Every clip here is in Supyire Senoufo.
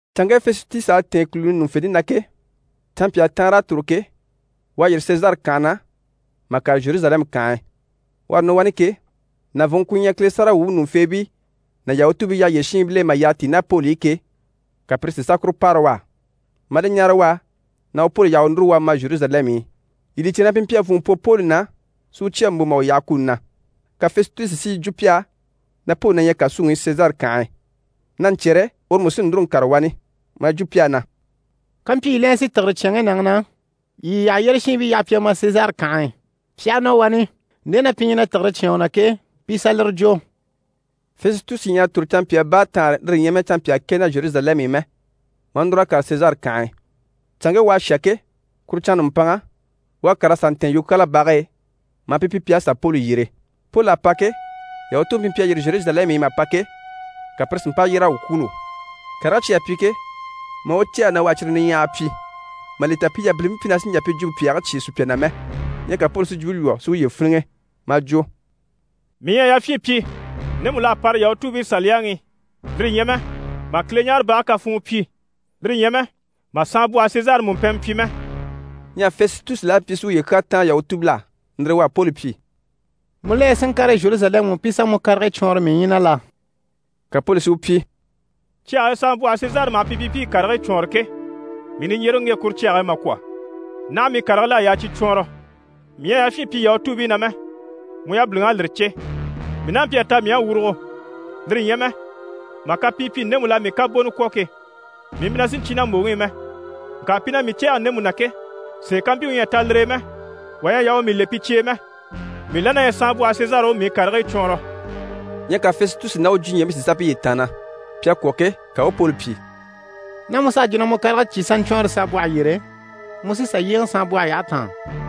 Canŋke Fɛsitusi à tɛ̀ɛn kùluni ɲùŋufente na ke, canmpyaa taanr'à tòro ke, u à yîri Sezare kànhe na mà kàre Zheruzalɛmu kànhe e. U à nɔ wani ke, nàvunŋke ku ɲyɛ Kile sáragawwuubii ɲùŋufeebii ná Yahutuubii yyaha yyére shiinbil'e mà yyaha tíi ná Poli i ke, ka pire si sà kuru paara u á, maa li ɲáare u á na u Poli yaha u núru u a ma Zheruzalɛmu i. Yii li cè na pi mpyi a vùnŋɔ pwɔ Poli na si u cya mbò mà u yaha kuni na. Ka Fɛsitusi si yi jwo pi á na Poli na ɲyɛ kàsuŋi i Sezare kànhe e, na ɲcyɛ̀rɛ uru mú sí núru n‑kàre wani. Maa yi jwo pi á na: «Kampyi yii la ɲyɛ si tìgire cyán ŋge nàŋi na, yii yii yyaha yyére shiinbii yaha pi a ma Sezare kànhe e. Pi aha nɔ wani, nde na pi ɲyɛ na tìgire cyáan u na ke, pi i sà lire jwo.» Fɛsitusi ɲyɛ a tòro canmpyaa baataanre, lire ɲyɛ mɛ canmpyaa kɛ na Zheruzalɛmu i mɛ, maa núr'a kàre Sezare kànhe e. Canŋke u à shà ke, kuru canŋa nùmpanŋa, u à kàr'a sà ntɛ̀ɛn yukyaala bage e, maa pi pyi pi à sà Poli yyere. Poli à pa ke, Yahutuubii pi mpyi a yîri Zheruzalɛmu i mà pa ke, ka pire si mpa yyér'a u kwûulo, karigii cyi à pi ke, maa u cɛ̂ɛgɛ na u à cyire niɲyahagii pyi, mà li ta pi yabilimpii mpyi na sì n‑jà pi jwumpe pyàagii cyêe sùpya na mɛ. Ɲyɛ ka Poli si jwumpe lwɔ́ si uye fíniŋɛ maa jwo: «Mii ɲyɛ a yafyin pyi ndemu l'à para Yahutuubii Saliyaŋi i, lire ɲyɛ mɛ mà Kileɲaarebage kafuun pyi, lire ɲyɛ mɛ mà saanbwɔhe Sezari mùmpɛnmɛ pyi mɛ.» Ɲyɛ Fɛsitusi la mpyi si uye kyaa táan Yahutuubil'á, lire e u à Poli pyi: «Mu la ɲyɛ si ŋkàre Zheruzalɛmu i pi i sà mu karigii cwɔɔnrɔ mii ɲyii na la?» Ka Poli si u pyi: «Cyage e saanbwɔhe Sezari maha pi pyi pi i karigii cwɔɔnre ke, mii niɲjyereŋi u ŋge kuru cyage e mà kwɔ̀, naha mii karigil'à yaa cyi cwɔɔnrɔ. Mii ɲyɛ a yafyin pyi Yahutuubii na mɛ, mu yabiliŋ'à lire cè. Mii n'a mpyi a ta mii à wurugo, lire ɲyɛ mɛ mà kapii pyi ndemu l'à mii kabonɔ kwɔ̀ ke, mii mpyi na sì n‑cyé na mbòŋi i mɛ. Ŋka pi na mii cɛ̂ɛge ndemu na ke, sèe ká mpyi u ɲyɛ a ta lire e mɛ, wà ɲyɛ a yaa u mii le pi cye e mɛ. Mii la na ɲyɛ saanbwɔhe Sezari u mii karigii cwɔɔnrɔ.» Ɲyɛ ka Fɛsitusi ná u jwuɲɛɛbii si sà piye taanna. Pi à kwɔ̀ ke, ka u u Poli pyi: «Ná mu s'à jwo na mu karigii cyi sà ɲcwɔɔnrɔ saanbwɔhe yyére, mu sí sà yyéeŋɛ saanbwɔhe yyahe taan.»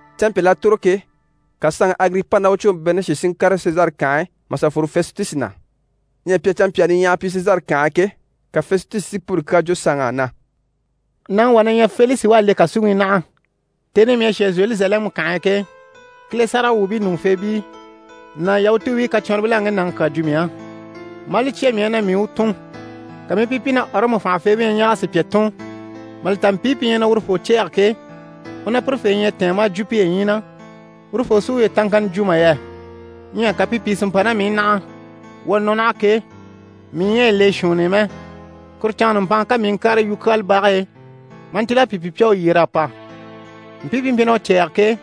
Canmpyal'à tòro ke, ka saanŋi Agiripa ná u cɔɔnŋi Berenishi si ŋkàre Sezare kànhe e mà sà fworo Fɛsitusi na. Ɲyɛ pi à canmpyaa niɲyahagii pyi Sezare kànhe e ke, ka Fɛsitusi si Poli kyaa jwo saanŋ'á na: «Nàŋi wà na ɲyɛ Felisi u à le kàsuŋi i naha. Tèni i mii à shà Zheruzalɛmu kànhe e ke, Kile sáragawwuubii ɲùŋufeebii ná Yahutuubii kacwɔnribil'à ŋge nàŋi kyaa jwo mii á, maa li cya mii á na mii u tùn. Ka mii i pi pyi na Ɔrɔmu fànhafeebii ɲyɛ na ɲɛɛg'a sùpya tùn, mà li ta mpii pi ɲyɛ na urufoo cɛ̂ɛge ke, u ná pirefee ɲyɛ a tɛ̀ɛn maa jwo piye ɲyii na urufoo sí uye taŋkanna jwo mà yɛ. Ɲyɛ ka pi pìi si mpa ná mii i naha. Wuu à nɔ naha ke, mii ɲyɛ a yi le shuunni i mɛ, kuru canŋa nùmpanŋa ka mii i ŋkàre yukyaala bage e maa ntíl'a pi pyi pi à u yyer'a pa. Mpii pi mpyi na u cɛ̂ɛge ke,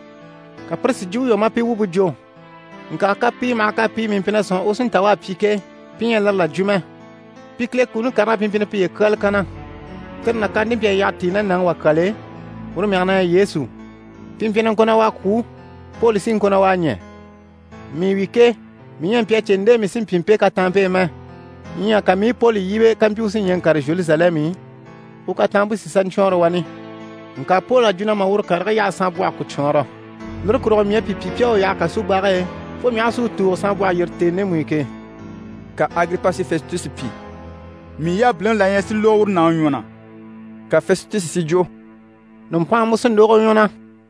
ka pire si jwumpe lwɔ́ maa pi wumpe jwo. Ŋka kapii maha kapii mii mpyi na sɔ̂nŋi u sí n‑ta u à pyi ke, pi ɲyɛ a lire là jwo mɛ. Pi Kile kuni karigii na pi mpyi na piye kyáali kanna. Tire nàkaante mpyi a yyaha tíi ná nàŋi wà kyal'e, uru mɛge na ɲyɛ Yesu. Pi mpyi na ŋko na u à kwû, Poli sí i ŋko na u à ɲɛ̀. Mii wi ke, mii ɲyɛ a mpyi a cè nde mii sí n‑pyi mpe kataanmpe e mɛ. Ɲyɛ ka mii i Poli yíbe kampyi u sí ɲɛɛ n‑kàre Zheruzalɛmu i, u kataanmpe si sà ɲcwɔɔnrɔ wani. Ŋka Poli à jwo na mà uru karigii yaha saanbwɔhe ku cwɔɔnrɔ, lire kurugo mii à pi pyi pi à u yaha kasubage e fo mii aha a si u tùugo saanbwɔhe yyére tèni ndemu i ke.» Ka Agiripa si Fɛsitusi pyi: «Mii yabiliŋi la na ɲyɛ si lógo uru nàŋi ɲwɔ na.» Ka Fɛsitusi si jwo: «Nùmpanŋa mu sí n‑lógo u ɲwɔ na.»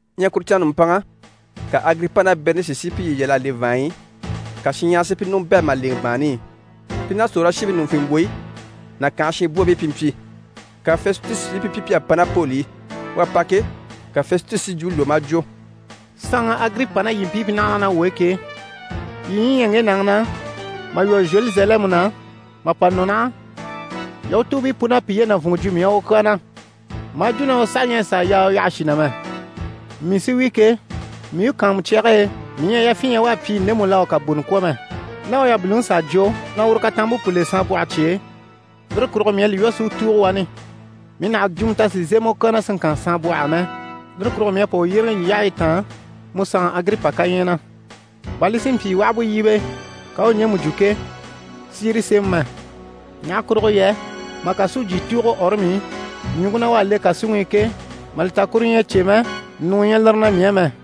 Ɲyɛ kuru canŋa nùmpanŋa, ka Agiripa ná Berenishi si piye yal'a le vàanɲyi i, ka shinɲyahara si pi ɲùŋɔ bɛ̂ mà lèŋɛ bàanni i. Pi ná sòrolashiibii ɲùŋufembwoyi ná kànhe shinbwoobii pi mpyi. Ka Fɛsitusi si pi pyi pi à pa ná Poli i. U à pa ke, ka Fɛsitusi si jwumpe lwɔ́ maa jwo: «Saanŋi Agiripa ná yii mpii pi naha naha ná wuu e ke, yii ɲyii ɲyɛ ŋge nàŋi na, mà lwɔ́ Zheruzalɛmu na, mà pa nɔ naha, Yahutuubii pun'à piye nàvunŋɔ jwo mii á u kyaa na, maa jwo na u saha ɲyɛ a sàa yaa u yaha shì na mɛ. Mii sí wi ke, mii u kàanmucyage e, mii ɲyɛ a yafyin ɲya u à pyi ndemu l'à u kabonɔ kwɔ̀ mɛ. Ná u yabiliŋi s'à jwo na uru kataanmpe pu le saanbwɔhe cye e, lire kurugo mii à li lwɔ́ si u tùugo wani. Mii nàha a jwumɔ ta si zémɛ u kyaa na si ŋkan saanbwɔh'á mɛ, lire kurugo mii à pa u yyéeŋɛ yii yyahayi taan, mu saanŋi Agiripa kaɲyɛɛ na, bà li si mpyi u aha bú yíbe, ka u u ɲjemu jwo ke, si yire sémɛ mɛ. Ɲaha kurugo yɛ mà kàsujyi tùugo Ɔrɔmu i, ɲùŋke na u à le kàsuŋi i ke, mà li ta kuru ɲyɛ a cè mɛ, ɲùŋɔ ɲyɛ lire na mii á mɛ.»